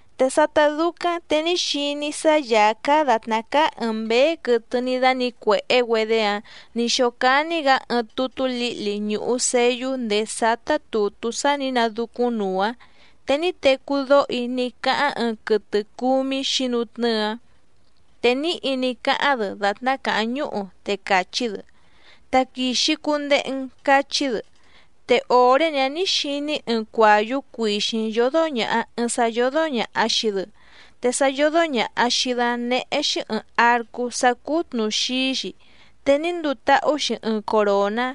Te sátá dúcáⁿ te ní xiní‑í sá Yàá cáá dàtná cáá ɨ̀ɨⁿ mbéé quɨtɨ ní dánǐcuèhé‑güedé‑áⁿ nǐ xócání‑gǎ ɨɨⁿ tutú lǐhli ñùhu seyú ndèé sátá tùtú sá nǐ nadúcúⁿ nuu‑áⁿ, te ní tecú dóho‑í ní cáháⁿ ɨɨⁿ quɨtɨ cúmí xǐnutnɨ́ɨ‑áⁿ, te níhi ní cáháⁿ‑dɨ dàtná càháⁿ ñúhu, te càchí‑dɨ: —¡Taquìxi cundehe‑n! —cachí‑dɨ. Te òré‑ni‑áⁿ nǐ xiní‑í ɨɨⁿ cuàyú cuìxíⁿ yódó ñàha ɨɨⁿ sá yódó ñàha xii‑dɨ, te sá yódó ñàha xii‑dɨ‑áⁿ néhé‑xí ɨ̀ɨⁿ arcú sá cúú tnùxií‑xi, te ní nduu táhú‑xi ɨɨⁿ coròná,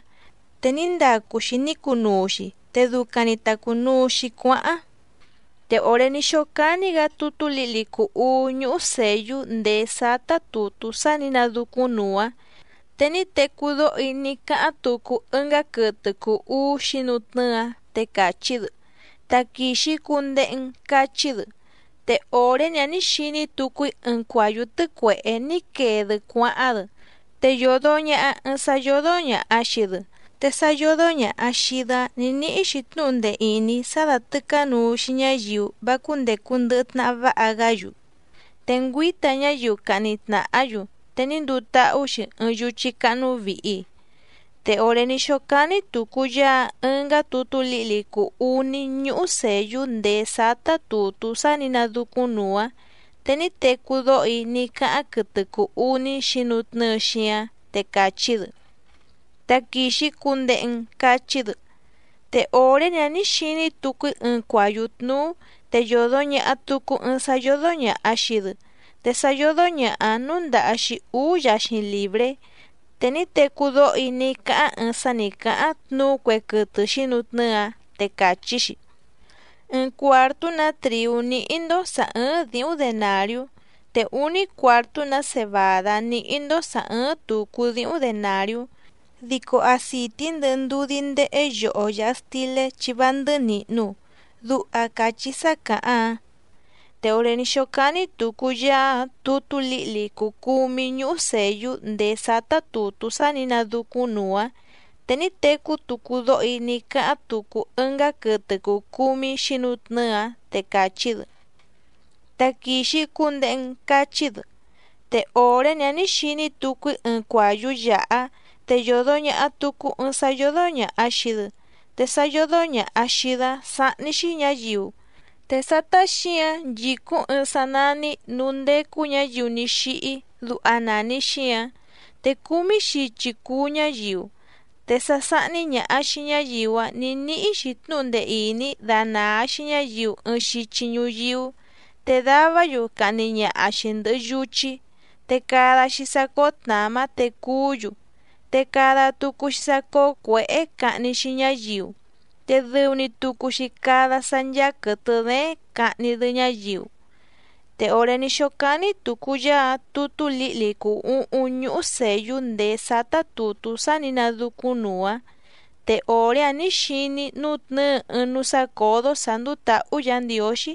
te ní ndacu‑xi ní cunuu‑xi te ducaⁿ‑ni ta cùnuu‑xi cuáháⁿ. Te òré ní xócání‑gǎ tutú lǐhli cùu uú ñúhú sèyú ndèé sátá tùtú sá nǐ nadúcúⁿ nuu‑áⁿ, te ní tecú dóho‑í ní cáháⁿ tucu ɨngá quɨtɨ cùu uú xǐnutnɨ́ɨ‑áⁿ, te càchí‑dɨ: —¡Taquìxi cundehe‑n! —cachí‑dɨ. Te òré‑ni‑áⁿ nǐ xiní tucu‑í ɨɨⁿ cuàyú tɨ́cuèhé ní quee‑dɨ cuáháⁿ‑dɨ, te yòdo ñaha ɨɨⁿ sá yódó ñàha xii‑dɨ, te sá yódó ñàha xii‑dɨ‑áⁿ nǐ níhí‑xi tnúhu ndee ìní sá dátɨ̀cánuu‑xi ñáyiu vá cúndècu ndɨhɨ tnaha váha‑gá‑yu, te ngüíta ñáyiu cahni tnàhá‑yu, te ní nduu táhú‑xi ɨɨⁿ yuchí cáhnú vìhi. Te òré ní xócání tùcu Yaá‑áⁿ ɨngá tutú lǐhli cùu uní ñúhú sèyú ndèé sátá tùtú sá nǐ nadúcúⁿ nuu‑áⁿ, te ní tecú dóho‑í ní cáháⁿ quɨtɨ cùu uní xǐnutnɨ́ɨ xíáⁿ, te càchí‑dɨ: —¡Taquìxi cundehe‑n! —cachí‑dɨ. Te òré‑ni‑áⁿ nǐ xiní tucu‑í ɨɨⁿ cuàyú tnúú te yòdo ñaha tucu ɨɨⁿ sá yódó ñàha xii‑dɨ, te sá yódó ñàha‑áⁿ núndàha‑xi úú yaxiⁿ lìbré. Te ní tecú dóho‑í ní cáháⁿ ɨɨⁿ sá nǐ cáháⁿ tnuú cue quɨtɨ xǐnutnɨ́ɨ‑áⁿ, te càchí‑xi: —Ɨɨⁿ cuàrtú‑nǎ trìú níhí‑ndó sǎ ɨ́ɨ́ⁿ dǐhúⁿ denàriú, te úní cuàrtú‑nǎ cebàdá níhí‑ndó sǎ ɨ́ɨ́ⁿ tùcu díhúⁿ denàriú, dico acìtí ndɨhɨ ndudí ndéhé yoho yàha stilé chi vá ndɨ́hɨ́ nìhnu —duha càchí sá càháⁿ‑áⁿ. Te òré ní xócání tùcu Yaá‑áⁿ tutú lǐhli cùu cumí ñúhú sèyú ndèé sátá tùtú sá nǐ nadúcúⁿ nuu‑áⁿ, te ní tecú tucu dóho‑í ní cáháⁿ tucu ɨngá quɨtɨ cùu cumí xǐnutnɨ́ɨ‑áⁿ, te càchí‑dɨ: —¡Taquìxi cundehe‑n! —cachí‑dɨ. Te òré‑ni‑áⁿ nǐ xiní tucu‑í ɨɨⁿ cuàyú yàhá, te yòdo ñaha tucu ɨɨⁿ sá yódó ñàha xii‑dɨ, te sá yódó ñàha xii‑dɨ‑áⁿ nání‑xí Sǎ xìhí, te xíǎⁿ sáhní‑xí ñǎyiu, te sátá xǐǎⁿ nchìcúⁿ sá nèhé núú ndécú ñǎyiu ní xíhí. Te cúmí xichi cùu ñuyíú, te sá sáhní ñàha xii ñáyiu‑áⁿ nǐ níhí‑xi tnúhu ndee ìní danàa‑xi ñáyiu ɨɨⁿ xichi ñuyíú, te davá‑yu cahni ñaha‑xi ndɨ̀hɨ yuchí, te cada‑xi sá cóó tnàmá te cuú‑yu, te cada tucu‑xi sá cóó cuěhé cahni‑xi ñáyiu, te dɨu‑ni tucu‑xi cada sá ncháá quɨ̀tɨ dééⁿ cahni‑dɨ ñáyiu. Te òré ní xócání tùcu Yaá‑áⁿ tutú lǐhli cùu uhúⁿ ñúhú sèyú ndèé sátá tùtú sá nǐ nadúcúⁿnuu‑áⁿ, te òré‑áⁿ nǐ xiní‑í nútnɨ̌ɨ ɨɨⁿ núú sácǒdó sǎ ndúú tǎhú Yǎ Ndiǒxí,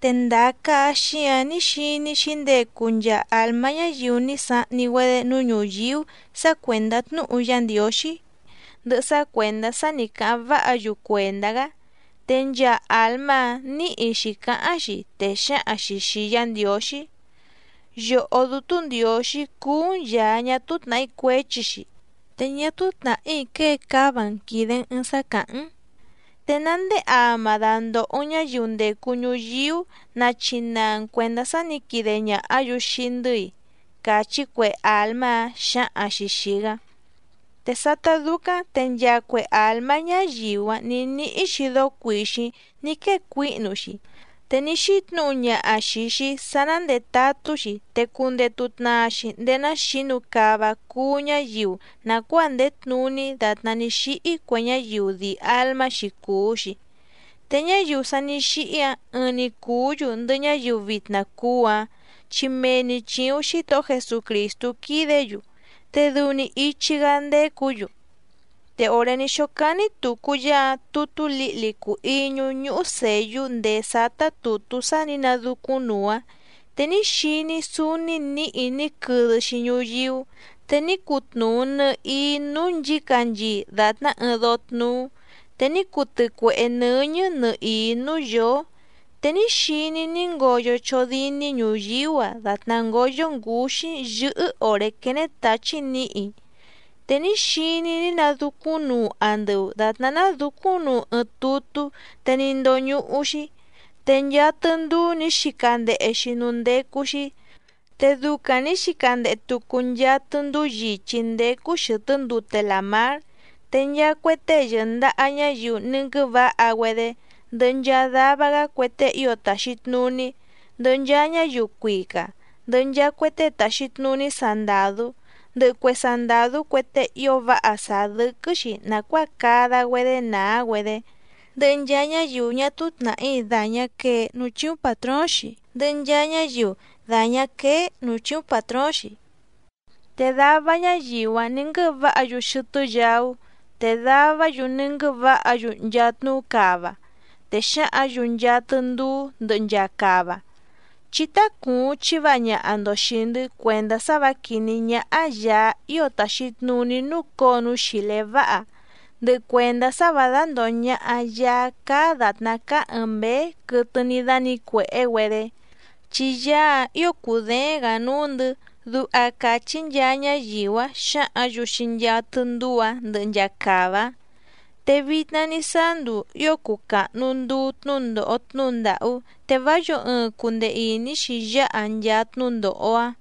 te ndàa caha xíǎⁿ ní xiní‑í xǐndecu nchaa àlmá ñáyiu ní sahni‑güedé núú ñùyíú sǎ cuèndá tnúhu Yá Ndiǒxí, ndɨhɨ sá cuèndá sá nǐ cáháⁿ váha‑yu cuèndá‑gá. Te nchaa àlmá‑áⁿ nǐhi xǐcáháⁿ‑xi, te xǎhaⁿ‑xi xìi Yá Ndiǒxí: —Yòhó Dútú Ndiǒxí cúú‑n Yàá ñá túú tnàhí cuéchi‑xi, te ñá túú tnàhí quée cáva‑n quìde‑n ɨɨⁿ sá càháⁿ‑n. ¿Te ná ndéé ama dandòho‑n ñáyiu ndècu ñuyíú nachinaa‑n cuèndá sá nǐ quide ñàhá‑yu xii‑ndɨ́‑i? —càchí cue àlmá‑áⁿ xǎhaⁿ‑xi xìi‑gá. Te sátá dúcáⁿ te nchaa cue àlmá ñáyiu‑áⁿ nǐ níhí‑xi dóó cuìxíⁿ ní quée cuíhnu‑xi, te ní xítnǔhu ñaha xìi‑xi sá ná ndètatú‑xi te cundetu tnaa‑xi ndéé ná xǐnu cava cuú ñáyiu nàcuáa ndèé tnuní dàtná ní xíhí cue ñáyiu dii àlmá‑xi cùu‑xi. Te ñáyiu sa ní xíhí‑áⁿ ɨɨⁿ‑ni cùú‑yu ndɨhɨ ñáyiu vitna cuú‑áⁿ chi mee‑ni chìuⁿ Xítohó Jesucrìstú quídě‑yu, te dɨu‑ni ichi‑gá ndécǔ‑yu. Te òré ní xócání tùcu Yaá‑áⁿ tutú lǐhli cùu iñú ñúhú sèyú ndèé sátá tùtú sá nǐ nadúcúⁿ nuu‑áⁿ, te ní xiní‑í súúní nǐhi ní quɨdɨ‑xi ñuyíú, te ní cutnuu nɨ̀hií núú nchǐcanchii dàtná ɨɨⁿ dóó tnúú, te ní cuu tɨcuèhé nɨ́ñɨ́ nɨhìí núú yǒó. Te ní xiní‑í ní ngoyo chódíní ñuyíú‑a dàtná ngóyó ngǔxí yɨ́hɨ́ òré quéné tǎchí nǐhi. Te ní xiní‑í ní nadúcúⁿnuu andɨu dàtná nádǔcúⁿnuu ɨɨⁿ tutú te ní ndóñúhú‑xí, te nchaa tɨndúú nǐ xica ndehe‑xi núú ndécú‑xí, te ducaⁿ nǐ xica ndehe tucu nchaa tɨndúú yìchí ndécú xɨ̀tɨ́ ndute làmár. Te nchaa cue tée yɨ̀ndaha ñáyiu ní nguɨ́vǎha‑güedé, ndɨhɨ nchaa dava‑gá cue tée ío tàxi tnuní, ndɨhɨ nchaa ñáyiu cuica, ndɨhɨ nchaa cue tée tàxi tnuní sandàdú, ndɨhɨ cue sandàdú cue tée ío váha sàá dɨ́quɨ́‑xi nàcuáa cada‑güedé nàá‑güedé, ndɨhɨ nchaa ñáyiu ñá túú tnàhí dàñá quee núú chíúⁿ pàtróóⁿ‑xi, ndɨhɨ nchaa ñáyiu dàñá quéé nǔú chìuⁿ patróóⁿ‑xi. Te dava ñáyiu‑áⁿ nǐ nguɨ́vǎha‑yu xɨtɨ́ yaú, te davá‑yu ní nguɨ́vǎha‑yu nchaa tnuú cava. Te xǎhǎⁿ‑yu nchaa tɨndúú ndɨhɨ nchaa cava: —Chí tácùuⁿ chiváha ñaha‑ndo xìi‑ndɨ́ cuèndá sá vǎ quìní ñáhá Yàá ío tàxi tnuní núcǒo núú xìlé váha, ndɨhɨ cuèndá sá vǎ dándòho ñaha Yaá cáá dàtná cáá ɨ̀ɨⁿ mbéé quɨtɨ ní dánǐcuèhé‑güedé, chi Yaá‑áⁿ ǐo cùdééⁿ‑gǎ núú‑ndɨ̌ —duha càchí nchaa ñáyiu‑áⁿ xǎhǎⁿ‑yu xii nchaa tɨndúú‑ǎⁿ ndɨhɨ nchaa cava‑áⁿ. Te vitna ní sáá nduu ío cùu cahnu nduu tnúndòho tnúhu ndàhú, te vá yǒo ɨɨⁿ cundee ìní‑xi yáha nchaa tnúndòho‑a.